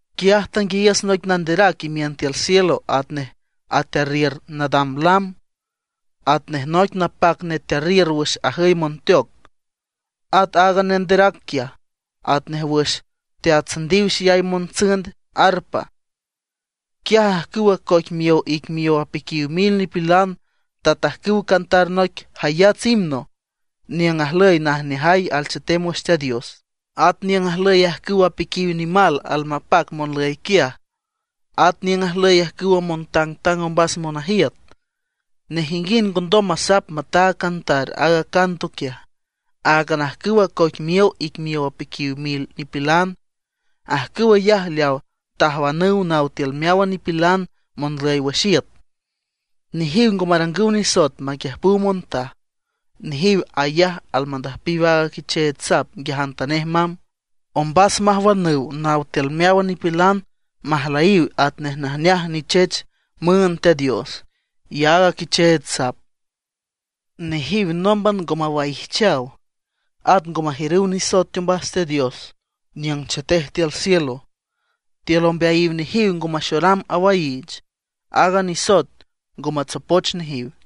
Quiaj tanguiayiüs noic nanderac imiün tiül cielo atnej atearriür nadam lam, atnej noic napac netearriür wüx ajüy monteoc. At aaga nanderac quiaj, atnej wüx teatsündiw xeyay montsünd arpa. Quiaj ajcüwa coic miow ic miow apiquiw mil nipilan tatajcüw cantar noic jayats himno niüng ajlüy najneajay alchetem wüx Teat Dios, at niüng ajlüy ajcüw apiquiw nimal almapac monlüy quiaj, at niüng ajlüy ajcüwa montangtang ombas monajiüt. Nejinguind ngondom masap mataag cantar aaga canto quiaj, áagan ajcüw acoic miow ic miow apiquiw mil nipilan. Ajcüw ayaj leaw tajwanüw naw tiül meáwan nipilan monlüy wüx iüt. Nejiw ngo marangüw nisoet maquiüjpüw montaj. Nejiw ayaj almandüjpiw aaga Quicheech Sap nguiajantanej mamb, ombas majwanüw naw tiül meáwan nipilan majlüyiw atnej najneaj nichech müünd Teat Dios y aaga Quicheech Sap. Nejiw nómban ngo mawaijchaw; at ngo majiürüw nisoet teombas Teat Dios niüng chetej tiül cielo. Tiül ombeayiw nejiw ngo maxoram awaiich, aaga nisoet ngo matsopoch nejiw.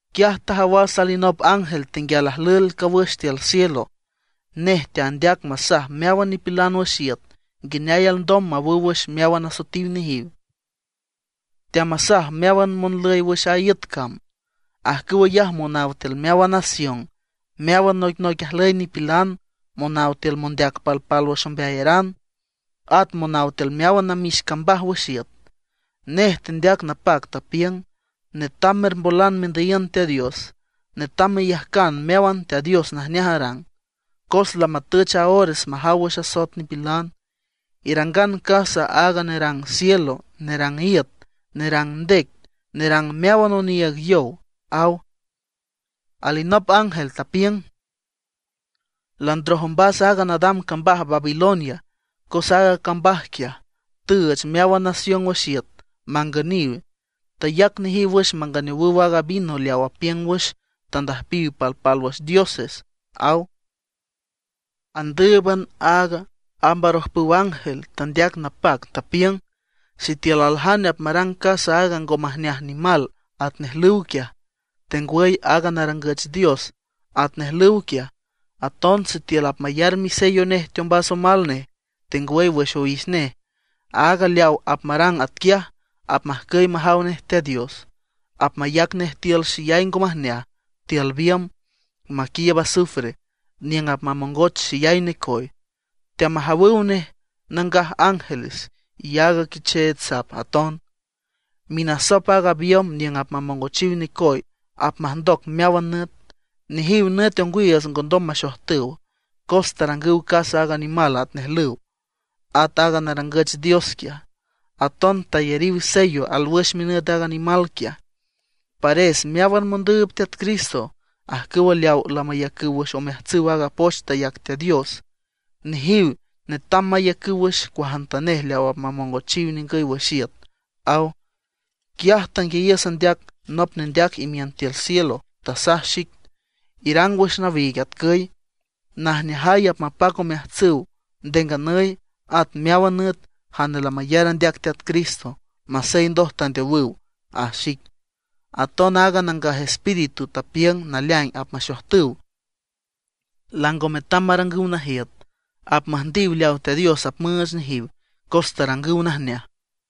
Quiaj tajawas alinop ángel tenguial ajlüel cawüx tiül cielo. Nej teandeac masaj meáwan nipilan wüx iüt nguineay alndom mawüw wüx meáwan asoetiw nejiw. Teamasaj meáwan monlüy wüx a iüt cam, ajcüw ayaj monaw tiül meáwan nación, meáwan noicnoic ajlüy nipilan, monaw tiül mondeac palpálwüx ombeayaran, at monaw tiül meáwan namix cambaj wüx iüt. Nej tendeac napac, tapiüng: ―Netam mermbolan mendüyiün Teat Dios, netam meyajcan mejawan Teat Dios najneaj arang. Cos lamatüch a ores majaw wüx asoet nipilan. Irangan casa aaga nerang cielo, nerang iüt, nerang ndec, nerang meáwan oniiüg yow ―aw. Alinop ángel tapiüng: ―Landroj ombas aaga nadam cambaj Babilonia cos aaga cambaj quiaj tüüch meáwan nación wüx iüt mangüniw; tayac nejiw wüx manganeowüw aaga vino leaw apiüng wüx tandüjpiw palpálwüx dioses ―aw. Andǘüban aaga amb arojpüw ángel tandeac napac, tapiüng: ―Sitiül aljane apmarang casa aaga ngo majneaj nimal atnej lüw quiaj, tengwüy aaga narangüch dios atnej lüw quiaj; aton sitiül apmayar misello nej teombas omal nej, tengwüy wüx owix nej, aaga leaw apmarang atquiaj apmajcüy majaw nej Teat Dios. Apmayac nej tiül xeyay ngo majneaj, tiül biümb maquiiüb azufre niüng apmamongoch xeyay necoy; teamajawüw nej nangaj ángeles y aaga Quicheech Sap aton. Minasop aaga biümb niüng apmamongochiw necoy apmajndoc meáwan nüt. Nejiw nüt ongwiiüts ngondom maxojtüw, cos tarangüw casa aaga nimal atnej lüw, at aaga narangüch dios quiaj. Aton tayariw sello alwüx minüt aaga nimal quiaj. Pares meáwan mondüüb Teat Cristo, ajcüwa leawa lamayacüw wüx omeajtsüw aaga poch tayac Teat Dios; nejiw netam maiücüw wüx cuajantanej leaw apmamongochiw ningüy wüx iüt ―aw. Quiaj tanguiayiüs andeac nop nendeac imiün tiül cielo, tasaj xic: ―Irang wüx nawiig atcüy: “Najneajay apmapac omeajtsüw nde nganüy at meáwan nüt jane lamayar andeac Teat Cristo masey ndoj tandeowüw”, aj xic. Aton aaga Nangaj Espíritu tapiüng naleaing apmaxojtüw, lango metam marangüw najiüt; apmüjndiw leaw Teat Dios apmüüch nejiw cos tarangüw najneaj.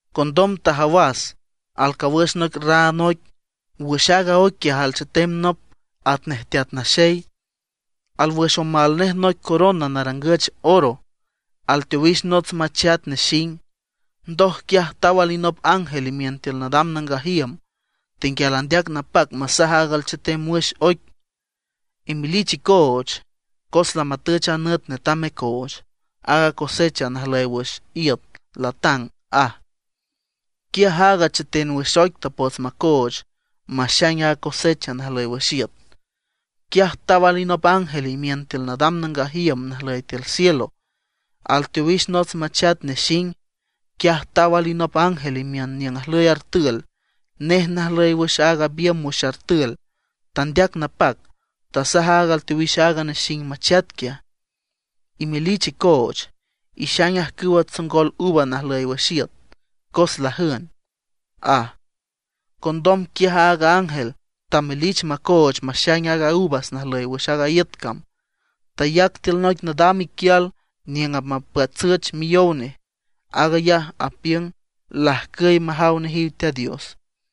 Condom tajawas, alcawüx noic raan oic. Wüx aaga oic quiaj alchetem nop atnej Teat Naxey. Alwüx omal nej noic corona narangüch oro; alteowix nots machat nexing. Ndoj quiaj taw alinop ángel imiün tiül nadam nangaj iüm, tenguial andeac napac masaj aaga alchetem wüx oic: ―Imelich icooch, cos lamatüch a nüt netam mecooch. Aaga cosecha najlüy wüx iüt latang ―aj. Quiaj aaga cheten wüx oic tapots macooch maxaing a cosecha najlüy wüx iüt. Quiaj taw alinop ángel imiün tiül nadam nangaj iüm najlüy tiül cielo, alteowix nots machat nexing. Quiaj taw alinop ángel imiün niüng ajlüy artül. Nej najlüy wüx aaga biümb wüx artül. Tandeac napac, tasaj aaga alteowix aaga nexing machat quiaj: ―Imelich icooch, ixaing ajcüwa tsongol uvas najlüy wüx iüt, cos lajün ―aj. Condom quiaj aaga ángel tamelich macooch maxaing aaga uvas najlüy wüx a iüt cam. Tayac tiül noic nadam iquial niüng apmapatsüch miyow nej. Aag ayaj apiüng lajcüy majaw nejiw Teat Dios.